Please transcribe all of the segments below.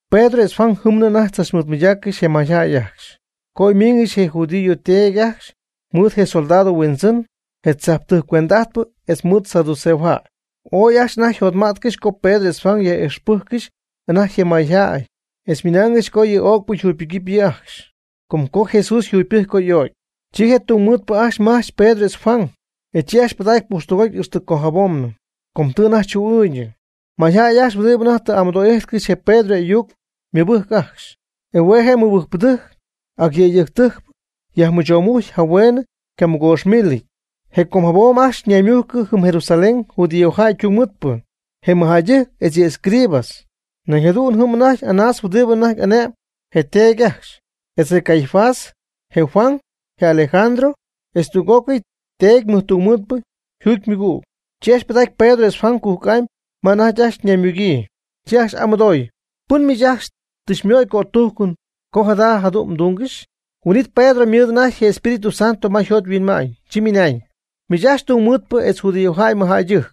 Pedro etz Juan jɨmnɨ anajty tzachmɨɨdmɨydaaccɨxy je mayjäy ajcxy, co oy miingɨxy je judío teedy ajcxy, mɨɨd je soldado huindzɨn, je tzajptɨjc cuend'ajtpɨ etz mɨɨd saduceojäy. Ooy ajcxy anajty yjotmätcɨxy co Pedro etz Juan yaj'ixpɨjccɨxy anajty je mayjäy etz nɨmaaygɨxy co yɨ öcpɨ jugypɨgɨpy yɨ' ajcxy, com co Jesús yjugypɨcy co y'o'cy. Chi je tungmɨɨdpɨ ajcxy majch Pedro etz Juan, e chi ajcxy pɨdacy pujxtɨgoty ixtɨ com jabomnɨ, com tɨ anajty chu'ɨɨñ. Mayjäy ajcxy huɨdibɨ anajty tɨ amɨdo'ijtcɨxy je Pedro y'ayuc ymɨbɨjc ajcxy. E hue' je mɨbɨjcpɨdɨjc, ac yëydɨjctɨjcpɨ, yajmɨchomujcy jahueen ycamɨgoox mílɨty. Je com jabom ajcxy ñaymújccɨ jɨm Jerusalén judíojäy tungmɨɨdpɨ, je mɨjjäydɨjc etz yɨ escribas. Nañ jadu'n jɨm anajty Anás huɨdibɨ anajty ane'mb je teedy ajcxy, etz je Caifás, je Juan, je Alejandro, etz tüg'ócɨy teedy mɨjtungmɨɨdpɨ yjugymɨgüg. Chi ajcxy pɨdacy Pedro etz Juan cujc'amy ma anajty ajcxy ñaymugyii, chi ajcxy y'amɨdooy: ―¿Pɨn miich ajcxy tɨ xymöy cötujcɨn co jada jadu'n tɨ mdungɨxy? Huin'it Pedro ymɨɨd anajty Espíritu Santo ma yjot yhuinma'ñ, chi ymɨnañ: ―Miich ajcxy tungmɨɨdpɨ etz judíojäy mɨjjäydɨjc,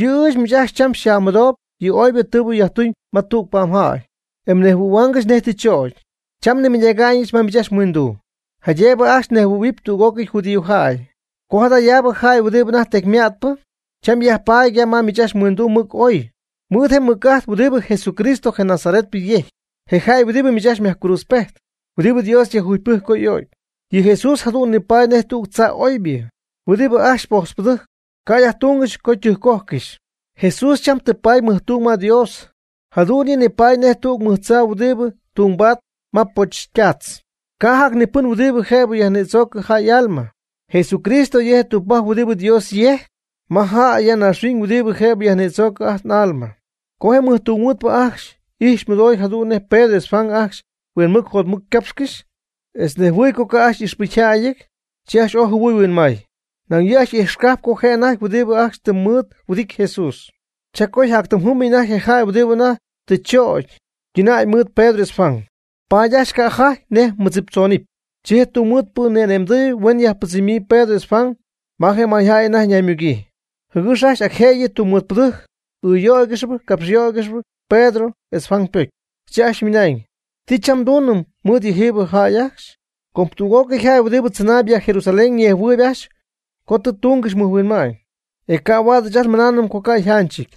yɨ' ɨɨch miich ajcxy cham xyaj'amɨdoob yɨ oybɨ tɨɨbɨ yajtuñ ma tüg pa'mjäy e nejhuɨ̈huaangɨxy nej tɨ chögy. Cham nimɨydactäyɨch ma miich ajcxy mhuinduu, jaydëbɨ ajcxy nejhuɨydähuɨpy tüg'ócɨy judíojäy, co jadayaabɨ jäy huɨdibɨ anajty tecyma'tpɨ, cham yajpaady ya ma miich ajcxy mhuinduu mɨc oy, mɨɨd je mɨc'ajt huɨdibɨ Jesucristo je Nazaretpɨ yejcpy, je jäy huɨdibɨ miich ajcxy myajcruudzpejt, huɨdibɨ Dios yajjugypɨjc co y'o'cy. Yɨ Jesús jadu'n nipaady nej tüg tzaa oybɨ, huɨdibɨ ajcxy potzpɨdɨjc, ca' yajtúngɨxy co ytɨjccojcɨxy. Jesús cham tɨ paady mɨjtung ma Dios, jadu'n yɨ' ni paady nej tüg mɨj tzaa huɨdibɨ ytungbaatp ma poch ytaatz. Ca' jac ni pɨn huɨdibɨ jëbɨ xyajnïdzoocɨm ajt n'alma. Jesucristo yɨ' je' tügpajc huɨdibɨ Dios yejc ma jäy ya naaxhuiñ huɨdibɨ jëbɨ xyajnïdzoocɨm ajt n'alma. Co je mɨjtungmɨɨdpɨ ajcxy ijxy mɨdoy jadu'n nej Pedro etz Juan ajcxy huinmɨc jotmɨc ycapxcɨxy, etz nejhuɨɨy co ca' ajcxy y'ixpɨcyjäyɨty, chi ajcxy ooy jɨhuɨy huinmay. Nañ yɨ' ijxcajp ajcxy co je' anajty huɨdibɨ ajcxy tɨ mɨɨd huɨdity Jesús. Cha co yjactɨmjɨ́mɨty anajty je jäy huɨdibɨ anajty tɨ chögy ytɨnäy mɨɨd Pedro etz Juan, paady ajcxy ca'jajty nej mɨdziptzoonɨpy. Chi je tungmɨɨdpɨ ni'ane'mdɨy huen yajpɨdzɨmyii Pedro etz Juan ma je mayjäy anajty ñaymugyii, jɨgɨx ac jëyɨ tungmɨɨdpɨdɨjc ɨɨyöyaangɨxy capxyöyaangɨxy Pedro etz Juan ypocy. Chi ajcxy ymɨnañ: ―¿Ti cham nduunɨm mɨɨd yɨjiibɨ jäy ajcxy? Com tüg'ócɨy jäy huɨdibɨ tzɨnaayb ya Jerusalén ñejhuɨɨyb ajcxy co tɨ túngɨxy mɨjhuinma'ñ, e ca' huaad ɨɨch ajt nmɨnaanɨm co ca' yjanchɨty.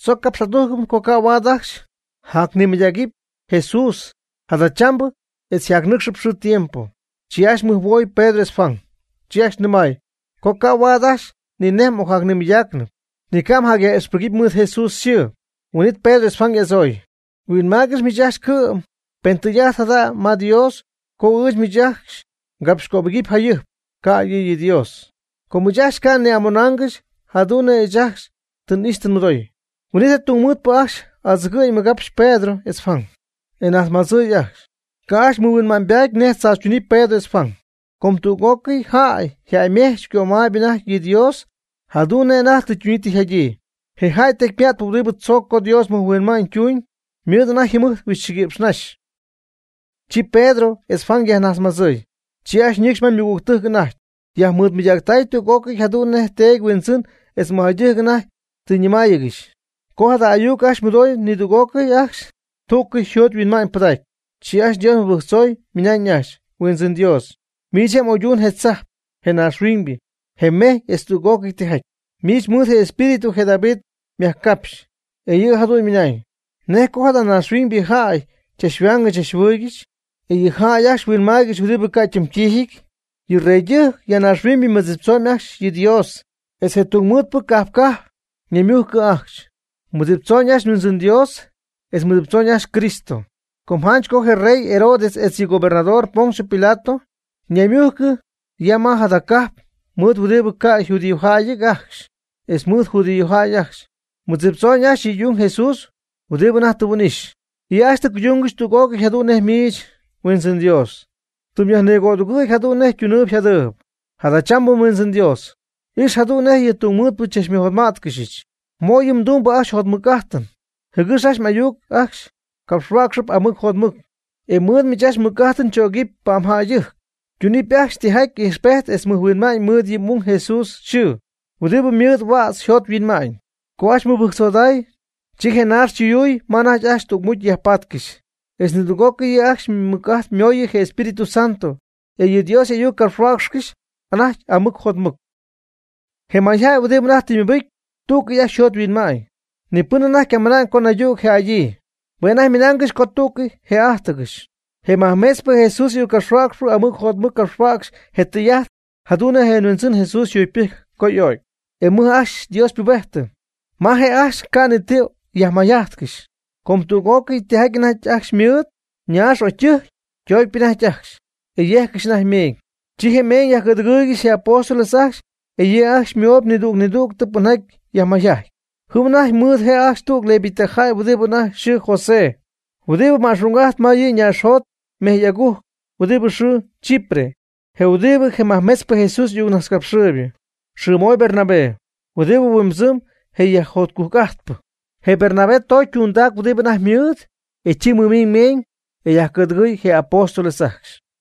Tzoc capx'adujcɨm co ca' huaad ajcxy jacnimɨydägɨpy Jesús jadachambɨ etz jacnɨcxpɨ xɨɨ tiempo. Chi ajcxy mɨjhuoy Pedro etz Juan, chi ajcxy nɨmay co ca' huaad ajcxy ni nej ocnimɨydaacnɨp, ni ca' jacyaj'ixpɨgɨpy mɨɨd Jesús yxɨɨ. Huin'it Pedro etz Juan y'adzooy: ―Huinmaaygɨx miich ajcxy cɨ'm pen tɨy'ajt jada ma Dios co ɨɨch miich ajcxy ngapxycöbɨgɨpy jayɨjp, ca'ydɨ yɨ Dios. Com ɨɨch ajcxy ca' nni'amonaangɨxy jadu'n nej ɨɨch ajcxy tɨ n'ixy tɨ nmɨdoy. Huin'it je tungmɨɨdpɨ ajcxy adzɨgɨ'ñ mɨgapxy Pedro etz Juan, e najtzmadzɨɨy ajcxy. Ca' ajcxy mɨhuinma'ñybaty nej tzaachytunɨpy Pedro etz Juan. Com tüg'ócɨy jäy yjäymejchpy ycömaayb anajty yɨ Dios jadu'n nej anajty tɨ ytuñyii tɨ yjadyii. Je jäy tecyma'tpɨ huɨdibɨ tzooc co Dios mɨjhuinma'ñ ytuñ, ymɨɨd anajty yjɨmɨjt huixchɨguïpx naxy. Chi Pedro etz Juan co yajnajtzmadzɨɨy, chi ajcxy ñɨcxy ma ymɨgügtɨjc anajty, yajmɨɨdmɨydactay tüg'ócɨy jadu'n nej teedy huindzɨn etz mɨjjäydɨjc anajty tɨ ñɨmáayɨgɨxy. Co jada ayuc ajcxy mɨdoy nidüg'ócɨy ajcxy tú'cɨy yjot yhuinma'ñ pɨdacy, chi ajcxy Dios mɨbɨjctzoy ymɨnañ ajcxy: ―Huindzɨn Dios, miich je' tɨ m'oyduñ je tzajp, je naaxhuiñybɨ, je mejy etz tüg'ócɨy tijaty. Miich mɨɨd mEspíritu je David myajcapxy, e yɨ' jadu'n ymɨnañ: ¿Nej co jada naaxhuiñybɨ jäy chachhuaangɨxy chachjɨhuɨɨygɨxy, e yɨ jäy ajcxy huinmaaygɨxy huɨdibɨ ca' ytimytiijɨty? Yɨ reydɨjc ya naaxhuiñybɨ mɨdziptzooñ ajcxy yɨ Dios. Etz je tungmɨɨdpɨ cajp cajp ñaymujcɨ ajcxy, mɨdziptzoñ ajcxy Huindzɨn Dios, etz mɨdziptzoñ ajcxy Cristo. Com janch co je rey Herodes etz yɨ gobernador Poncio Pilato ñaymujcɨ ya ma jada cajp mɨɨd huɨdibɨ ca' yjudíojäyɨty ajcxy etz mɨɨd judíojäy ajcxy, mɨdziptzoñ ajcxy yɨ m'ung Jesús huɨdi anajty tɨ mhuin'ixy. Yɨ' ajcxy tɨ cuydungɨxy tüg'ócɨy jadu'n nej miich, Huindzɨn Dios, tɨ myajnigödugɨ̈y jadu'n nej ytunɨɨyb yjadɨɨyb. Jadachambɨ Huindzɨn Dios, ix jadu'n nej yɨ tungmɨɨtpɨ xychachmɨjotmá'tcɨxyɨch. Mo' yɨ mdumbɨ ajcxy jotmɨc'ájtɨn, jɨgɨx m'ayuc ajcxy capxhuäcxɨpy amɨc jotmɨc, e mɨɨd miich mmɨc'ájtɨn chögɨpy pa'mjäydɨjc, tunɨpy ajcxy tijaty ijxpejt etz mɨjhuinma'ñ mɨɨd yɨ m'ung Jesús yxɨɨ, huɨdibɨ mɨɨd huädz yjot yhuinma'ñ. Co ajcxy mɨbɨjctzoday, chi je naax chuyuuy ma anajty ajcxy tügmucy yajpaatcɨxy, etz nidüg'ócɨy yɨ' ajcxy ymɨc'ajt mooyɨ je Espíritu Santo, e yɨ Dios y'ayuc capxhuäcxcɨxy anajty amɨc jotmɨc. Je mayjäy huɨdibɨ anajty tɨ mɨbɨcy, tú'cɨy ajcxy yjot yhuinma'ñ. Ni pɨn anajty ycamɨna'ñ co naydüg jë'adyii. Hue' anajty ymɨnaangɨxy co tú'cɨy jë'ájtɨgɨxy. Je majmetzpɨ Jesús y'ayuccapxhuäcxpɨ amɨc jotmɨc capxhuäcxy je tɨy'ajt jadu'n nej je Huindzɨn Jesús yjugypɨjcy co y'o'cy. E mɨj ajcxy Dios ypubejtɨ. Ma je' ajcxy ca' ni ti yajmayjajtcɨxy, com tüg'ócɨy tijaty anajty ajcxy ymɨɨd ñaax o ytɨjc ytoocpy anajty ajcxy, e yejccɨxy anajty meeñ. Chi je meeñ yajcɨ̈dɨgɨɨygɨxy je apóstoles ajcxy e yɨ' ajcxy moy nidüg nidüg pɨnjaty yajmayjajtp. Jɨm anajty mɨɨd je' ajcxy tüg levita jäy huɨdi anajty yxɨɨ José, huɨdibɨ ma'xung'ajt ma yɨ ñaaxjot mejy agujc huɨdibɨ yxɨɨ Chipre, je huɨdibɨ je majmetzpɨ Jesús y'ayuccapxhuäcxpɨ, yxɨɨ moy Bernabé, huɨdibɨ huimbɨdzɨm je yajjotcujc'ajtpɨ. Je Bernabé tocy ytundac huɨdibɨ anajty ymɨɨd, e chi mɨmiiñ je meeñ, e yajcɨ̈dɨgɨy je apóstoles ajcxy.